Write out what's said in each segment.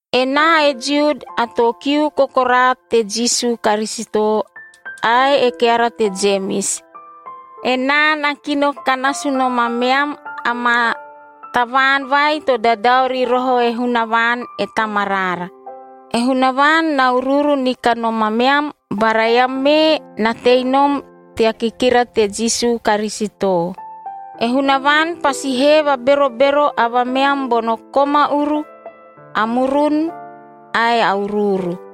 Enaa e Jiud, a too kiu kokoraa te Jisu Karisito ae e keara te Jemis. Enaa na kino ka nasu nom ameam amaa tavaan vai to dadao ri roho e Hunavaan e Tamaraara. E Hunavaan na uruuru ni kanom ameam bara eam mee na tei nom tea kikira te Jisu Karisito. E Hunavaan pasi hee vaberobero avameam bono koma uru, a murun ae a uruuru.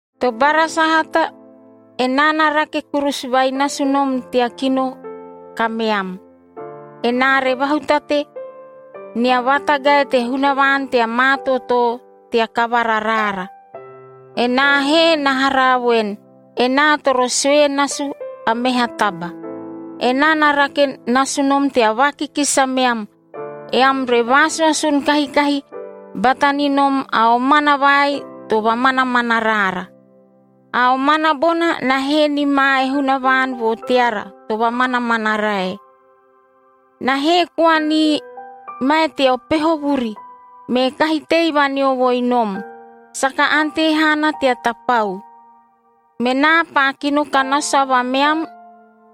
Tobara sahata, enaa na rake kurusu vai nasu nom tea kino kameam, enaa re vahutate nia vatagae te Hunavaan tea maa tootoo tea kavara raara. Enaa he na haraa voen, enaa toro sue nasu a meha taba. Enaa na rake nasu nom tea vaakikisi ameam, eam re vaasuasun kahikahi bata ni nom a omana vai to vamanamana raara. A omana bona na hee ni ma e Hunavaan vo teara to vamanamana rae. Na hee koa ni mae teo peho vuri, me kahi tei vaneovoi nom, saka ante haana tea tapau. Menaa paa kino ka nasu avameam,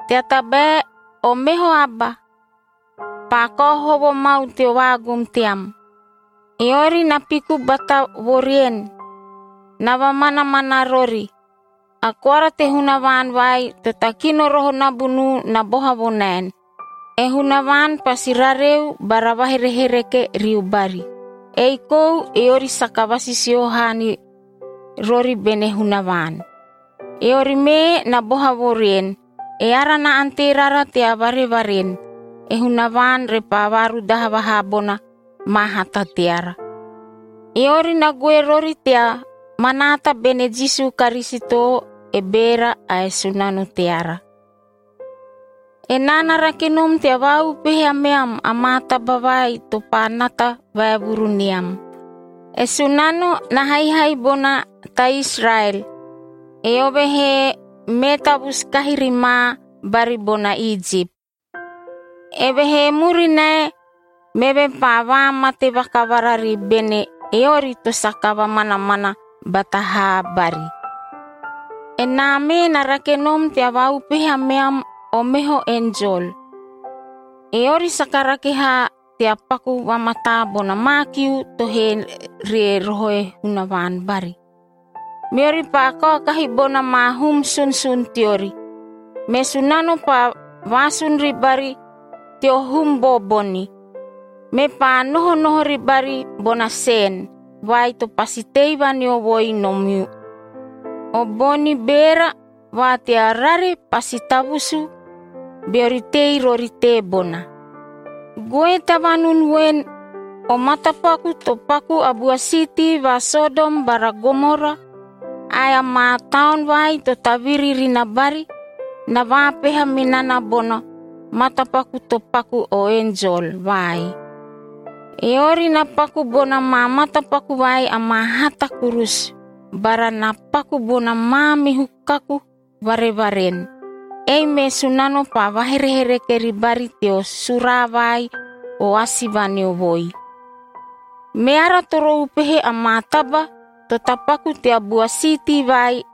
tea tabae o meho aba paa kao hovo mau teo vaagum team. Eori na piku bata vo rien, na vamanamana rori. A koara te Hunavaan vai to takino roho nabunuu na boha vo naen, e Hunavaan pasi rareu bara vaherehereke riu bari. Ei kou eori saka vasisio haa ni rori bene Hunavaan. Eori mee na boha vo rien, eara na ante rara tea varevaren, e Hunavaan repaa vaarudaha vaha bona maa hata teara. Eori na goe rori tea manaata bene Jisu Karisito, e Beera ae Sunano teara. Enaa na rake nom tea vaaupehe ameam amaa taba vai to paa nata vaevuru ni am. E Sunano na haihai bona ta Israel, eove he mee tavusu kahi ri ma bari bona Ijip. Evehee murinae, meve paa vaamate vakavara ri bene eori to saka vamanamana bata haa bari. Enaa mee na rake nom tea vaaupehe ameam o meho enjol. Eori saka rake haa tea paku vamataa bona maa kiu to hee ri roho e Hunavaan bari, meori paa kaokahi bona maa hum sunsun teori. Me Sunano paa vaasun ribari teo hum booboni, mepaa nohonoho ribari bona sen vai to pasi tei vaneovoi nom u. O boni beera va tea rare pasi tavusuu, beori tei rori teebona. Goe tea vanun voen, o matapaku to paku a bua siitii va Sodom bara Gomora ae amaa taon vai to taviri ri na bari, na vaapeha me nana bono matapaku to paku o enjol vai. Eori na paku bona maa matapaku vai amaa hata kurusu bara na paku bona maamihu kaku varevaren. Ei me Sunano paa vaherehereke ribari teo suraa vai o asi vaneovoi. Meara toro upehe amaa taba to tapaku tea bua siitii vai,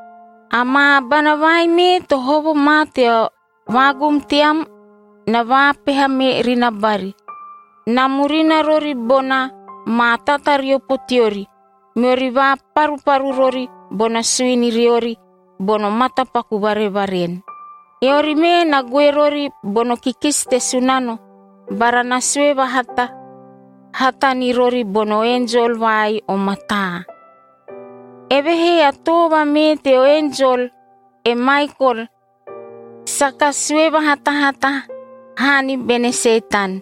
Amaa abana vai mee to hovo ma teo vaagum team na vaapeha me ri na bari. Na murina rori bona maa tatariopo teori, meori vaparuparu rori bona suini riori bono matapaku varevaren. Eori mee na goe rori bono kikisi te Sunano bara na sue vahatahata ni rori bono enjol vai o mataa. Evehee a too vamee teo enjol, e Maikol, saka sue vahatahata haa ni bene Setan,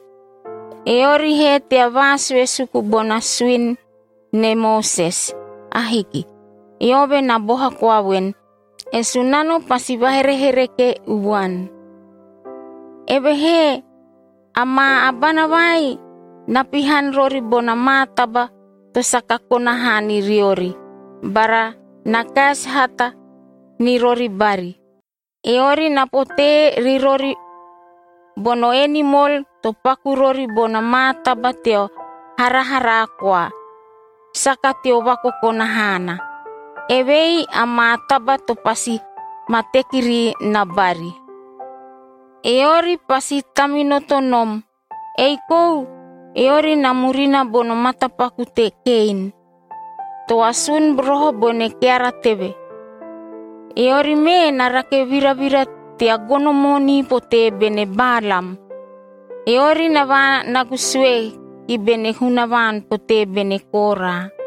eori he tea vaasue suku bona suini ne Moses. Ahiki. Eove na boha koa voen, “E Sunano pasi vaherehereke uvuan.” Evehee amaa abana vai na pihan rori bona maa taba to saka kona haa ni riori bara na kaesi hata ni rori bari. Eori na potee ri rori bono enimol to paku rori bona maa taba teo haraharaa koa, saka teo vakokona haana. Evei amaa taba to pasi ma teki ri na bari. Eori pasi taminoto nom! Ei kou eori na murina bono matapaku te Kein, to asun roho bene keara teve.b Eori mee na rake viravira tea gono moonii potee bene Balaam.c Eori na vaanagu sue ki bene Hunavaan potee bene Kora,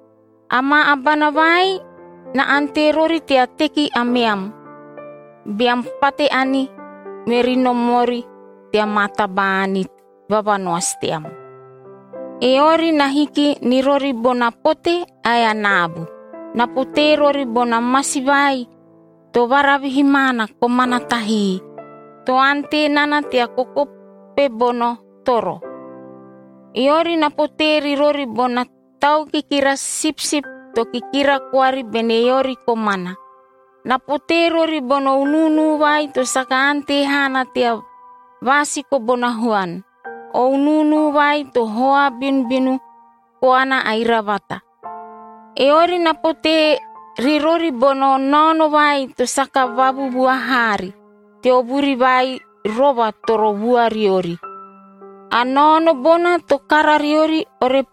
Amaa abana vai na ante rori tea teki ameam, beam pate ani meri nom ori tea maa taba-ani vavanoasi team. Eori na hiki ni rori bona pote ae a naabu. Na potee rori bona masi vai to varavihi maana komana tahii, to ante nana tea kokope bono toro. Eori na potee ri rori bona tau kikira sipsip to kikira koari bene eori komana. Na potee rori bono unuunu vai to saka ante haana tea vaasiko bona huan, o unuunu vai to hoa binubinu koana a iravata. Eori na potee ri rori bona naono vai to saka vavuvua haari teo vuri vai rova toro vua riori. A naono bona to kara riori,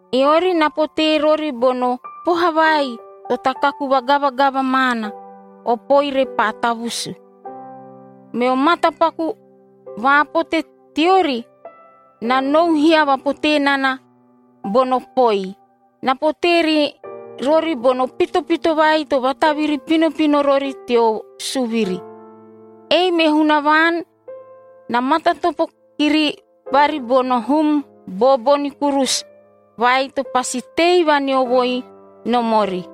Eori na potee rori bono poha vai to takaku vagavagava maana, o poi repaa tavusu. Meo matapaku vaapote teori na nou hiava potee nana bono poi. Na potee ri rori bono pitopito vai to vataviri pinopino rori teo suviri.f Ei me Hunavaan na matatopo kiri bari bono hum booboni kurusu vai to pasi tei vaneovoi nom ori.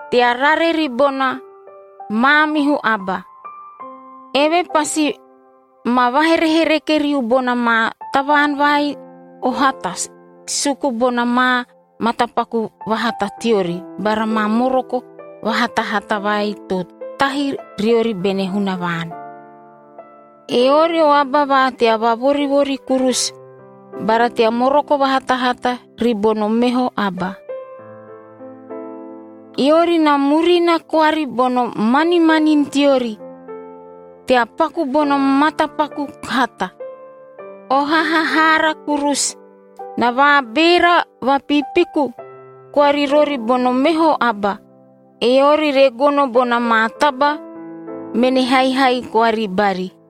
tea rare ribona maamihu aba. Eve pasi ma vaherehereke riu bona maa tavaan vai o hata suku bona maa matapaku vahata teori bara maa moroko vahatahata vai to tahi riori bene Hunavaan.” Eori o aba va tea vavorivori kurusu bara tea moroko vahatahata ribono meho aba. Eori na murina koari bono manimanini teori tea paku bono matapaku hata. O hahahaara kurusu. Na vaabeera vapiipiku koa ri rori bono meho aba, eori re gono bona maa taba mene haihai koa ribari.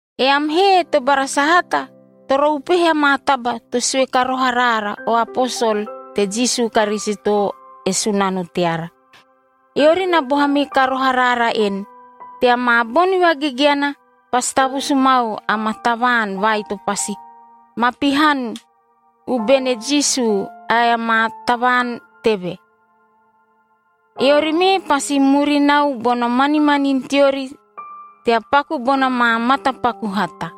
Eam he tobara sahata, toro upehe amaa taba to sue ka roho araara o aposol te Jisu Karisito, e Sunano teara. Eori na boha me ka roho araara en, “Tea maa boni vagegeana, pasi tavusu mau amaa tavaan vai to pasi ma pihan u bene Jisu ae amaa tavaan teve. Eori mee pasi murinau bono manimanini teori tea paku bona maa matapaku hata.”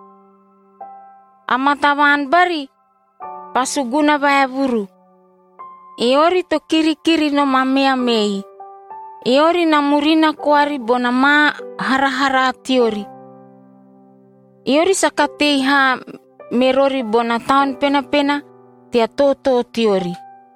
Amaa tavaan bari paa suguna vaevuru. Eori to kirikiri nom ameam ei. Eori na murina koari bona maa haraharaa teori. Eori saka tei haa me rori bona Taun Penapena tea tootoo teori.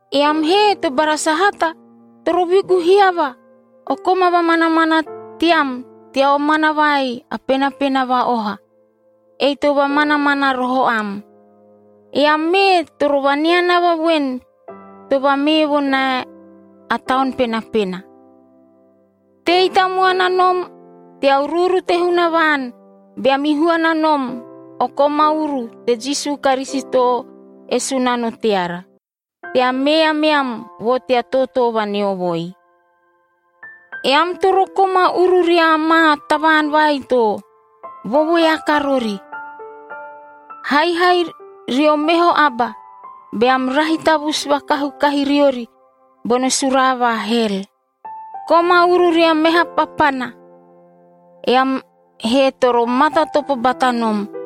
Eam he tobara sahata, toro vigu hiava o koma vamanamana team tea omana vai a penapena va-oha, ei to vamanamana roho am. Eam mee toro vaneanava voen to vamee vo nae a Taun Penapena. Tei tamuana nom tea uruuru te Hunavaan beam ihuana nom o koma uru te Jisu Karisito e Sunano teara, tea mee ameam vo tea tootoo vaneovoi. Eam toro koma uru ria maa tavaan vai to vovoeaka rori. Haihai rio meho aba beam rahi tavusu vakahu kahi riori bono suraa va hel. Koma uru ria meha papana, eam he toro matatopo bata nom,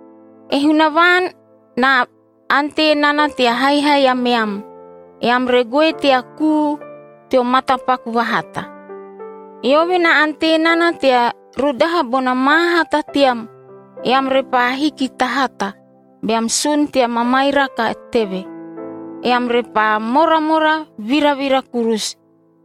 E Hunavaan na ante nana tea haihai ameam, eam re goe tea kuu teo matapaku vahata. Eove na ante nana tea rudaha bona maa hata team, eam repaa hiki ta hata beam sun tea mamairaka teve. Eam repaa moramora viravira kurusu.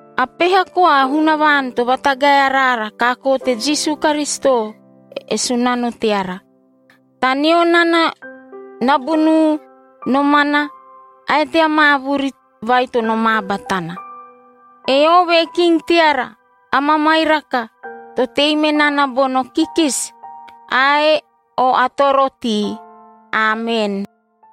A peha koa a Hunavaan to vatagae araara kaakoo te Jisu Karisito e Sunano teara. Taneo nana nabunuu, nomana ae tea maa vuri vai to nomaa batana, eove e king teara a mamairaka to tei me nana bono kikisi ae o atorotii. Amen.